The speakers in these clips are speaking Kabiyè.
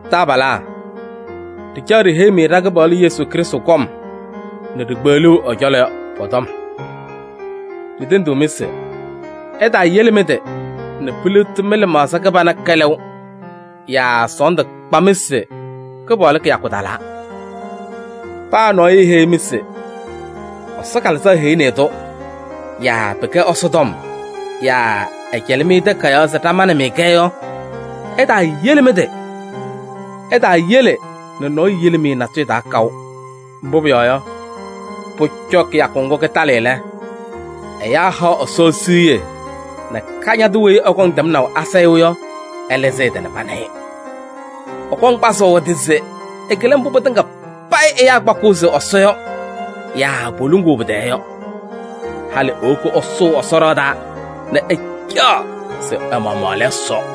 Taabalaa! Ɖɩcaɣ ɖiheyi-mɩ ɖa-Kɩpaɣlʋ Yesu Krɩstʋ kɔm nɛ ɖikpeɣluu ɛ-cɔlɔ yɔ pɔ-tɔm. Ɖitendiɣ-mɩ se: ɩtaayele mɩ-tɩ nɛ piliɣti mɩ-lɩmaɣza kɩbana kɛlɛʋ yaa sɔɔndʋ kpa-mɩ se Kɩpaɣlʋ kɩyakʋ talaa. Paa nɔɔyʋ eheyi-mɩ se Ɛsɔ Kalɩzaɣ heyini-i-tʋ yaa pɩkɛ Ɛsɔ tɔm yaa ɛcɛlɩ-mɩ takayaɣ se ɖamanɩ-mɩ-kɛ yɔ, ɩtaayele mɩ-tɩ. Ɩtaayele nɛ nɔɔyʋ yili-mɩ natʋyʋ taa kaʋ. Mbʋ pʋyɔɔ yɔ, pʋcɔ kɩyakʋ ŋgʋ kɩtalɩ lɛ, ɛyaa haɣ Ɛsɔ siɣye nɛ Kañadʋ weyi ɛkɔŋ tɛmnaʋ asayʋʋ yɔ, ɛlɩzɩ ɛ-tɩ nɛ pana-ɩ. Ɛkɔŋ kpazʋʋ ɛ-tɩ se ɛkɩlɩ mbʋ pɩtɩŋa payɩ ɛyaa kpakɩɣ se Ɛsɔ yɔ yaa poluŋuu pɩ-tɛɛ yɔ. Halɩ ewoki ɛsʋʋ Ɛsɔ ɖɩɣa taa nɛ ɛcaɣ se ɛ-maɣmaɣ lɛ Ɛsɔ.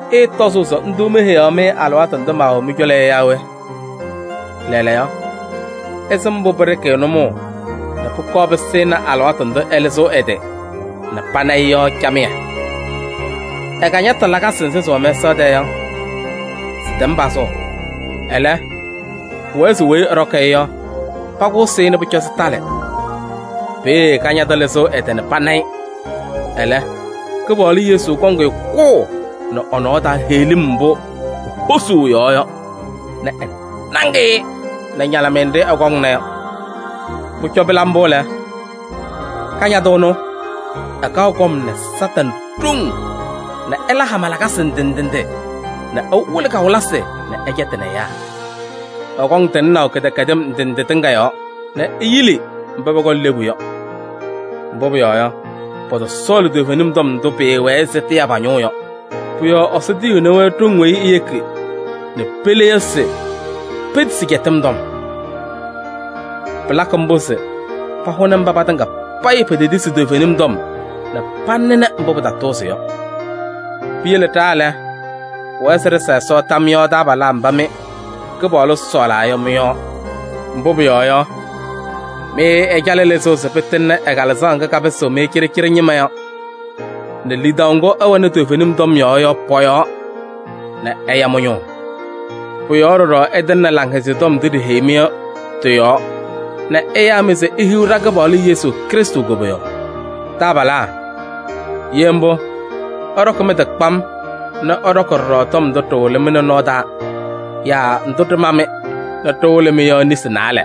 Ɩɩtɔzʋʋ se ndʋ meheyaɣ-mɩ alɩwaatʋ ndʋ maawɛ mɩ-cɔlɔ yɔ yaa we? Lɛɛlɛɛyɔ, ɩsɩm mbʋ pɩɖɩkɩ-ɩ nʋmɔʋ nɛ pʋkɔɔ pɩsɩnɩ alɩwaatʋ ndʋ ɛlɩzɩɣ ɛ-tɩ nɛ pana-ɩ yɔ camɩyɛ. Ɛ-kañatʋ lakasɩ nzɩ sɩwɛ mɛsaɣ tɛɛ yɔ, sɩtɛm pazʋʋ. Ɛlɛ, pʋwɛɛ se weyi ɛɖɔkɩ-ɩ yɔ, pakʋsɩ-ɩ nɛ pʋcɔ sɩtalɩ. Peeye Kañadʋ lɩzɩɣ ɛ-tɩ nɛ pana-ɩ, ɛlɛ, Kɩpaɣlʋ Yesu kɔŋ-ɩ kʋʋ nɛ ɛ-nɔɔ taa heɣlim mbʋ ehosuu ɛ-yɔɔ yɔ nɛ ɛnaŋ-ɩ nɛ ñalɩmɩyɛ nɖɩ ɛkɔŋna yɔ. Pʋcɔ pɩla mbʋ lɛ, Kañadʋ ɛnʋ, ɛkaɣ kɔm nɛ Satanɩ ɖoŋ nɛ ɛla hama lakasɩ ndɩ ndɩ nɛ ɛwɩlɩ kawɩlɩsɩ nɛ ɛcɛtɩnɩ ɛyaa. Ɛkɔŋ tɩŋnaʋ kɩdɛkɛdɩm ndɩ ndɩ tɩŋa yɔɔ nɛ eyili mba pɔkɔŋ lebu yɔ. Mbʋ pʋyɔɔ yɔ, pɔtɔsɔɔlɩ toovenim tɔm ndʋ pɩɩwɛɛ se tɩya pa-ñʋʋ yɔ. Pʋ-yɔɔ Ɛsɔ tiyiɣni-wɛ ɖoŋ weyi eyeki nɛ pele yɔ se petisi cɛtɩm tɔm. Pɩlakɩ mbʋ se pahʋnɩ mba patɩŋa payɩ petetisi toovenim tɔm nɛ panɩnɩ mbʋ pɩtatʋʋzɩ yɔ. Piyele ɖa lɛ, pʋwɛɛ se ɖɩsa Ɛsɔ tam yɔɔ taabalaa mba mɩ Kɩpaɣlʋ sɔɔlaa yɔ mɩ-yɔɔ. Mbʋ pʋyɔɔ yɔ, mɩ ɛcalɩ lɩzʋʋ se pɩtɩŋnɩ ɛ-Kalɩzaɣ ŋga kapɩsɩɣ-mɩ cɩɖɩcɩɖɩ ñɩma yɔ nɛ lidaʋ ŋgʋ ɩwɛnɩ toovenim yɔɔ yɔ pɔ-yɔɔ nɛ ɛya mɩ-ñʋʋ. Pʋ-yɔɔ ɖɔɖɔ ɛtɩŋnɩ Laŋhɛzɩyɛ Tɔm ndʋ ɖiheyi-mɩ yɔ, tɩ-yɔɔ nɛ ɛyaa-mɩ se ihiɣ ɖa-Kɩpaɣlʋ Yesu Krɩstʋ koboyaɣ. Taabalaa! Ye mbʋ, ɩɖɔkɩ mɩ-tɩ kpam nɛ ɩɖɔkɩ ɖɔɖɔ tɔm ndʋ ɖɩwɩlɩ-mɩ nɛ nɔɔ taa yaa ndʋ ɖɩma-mɩ nɛ ɖɩwɩlɩ-mɩ yɔ nesi naalɛ.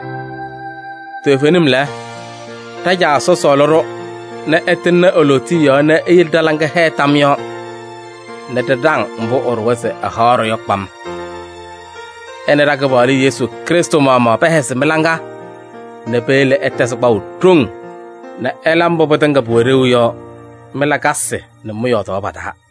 Toovenim lɛ, ɖa-Caa Ɛsɔ sɔɔlɩ-ɖʋ nɛ ɛtɩŋnɩ e-lootiye yɔɔ nɛ eyele ɖa-laŋa hɛɛ tam yɔɔ nɛ ɖɩɖaŋ mbʋ ɛɖʋwa se ɛhaɣ-ɖʋ yɔ kpam. Ɛ nɛ ɖa-Kɩpaɣlʋ Yesu Krɩstʋ maɣmaɣ pɛhɛzɩ mɩ-laŋa nɛ peyele ɩtɛzɩ kpaʋ ɖoŋ nɛ ɩla mbʋ pɩtɩŋa pʋwɛ ɖeu yɔ mɩ-lakasɩ nɛ mɩ-yɔɔdaɣ pa-taa.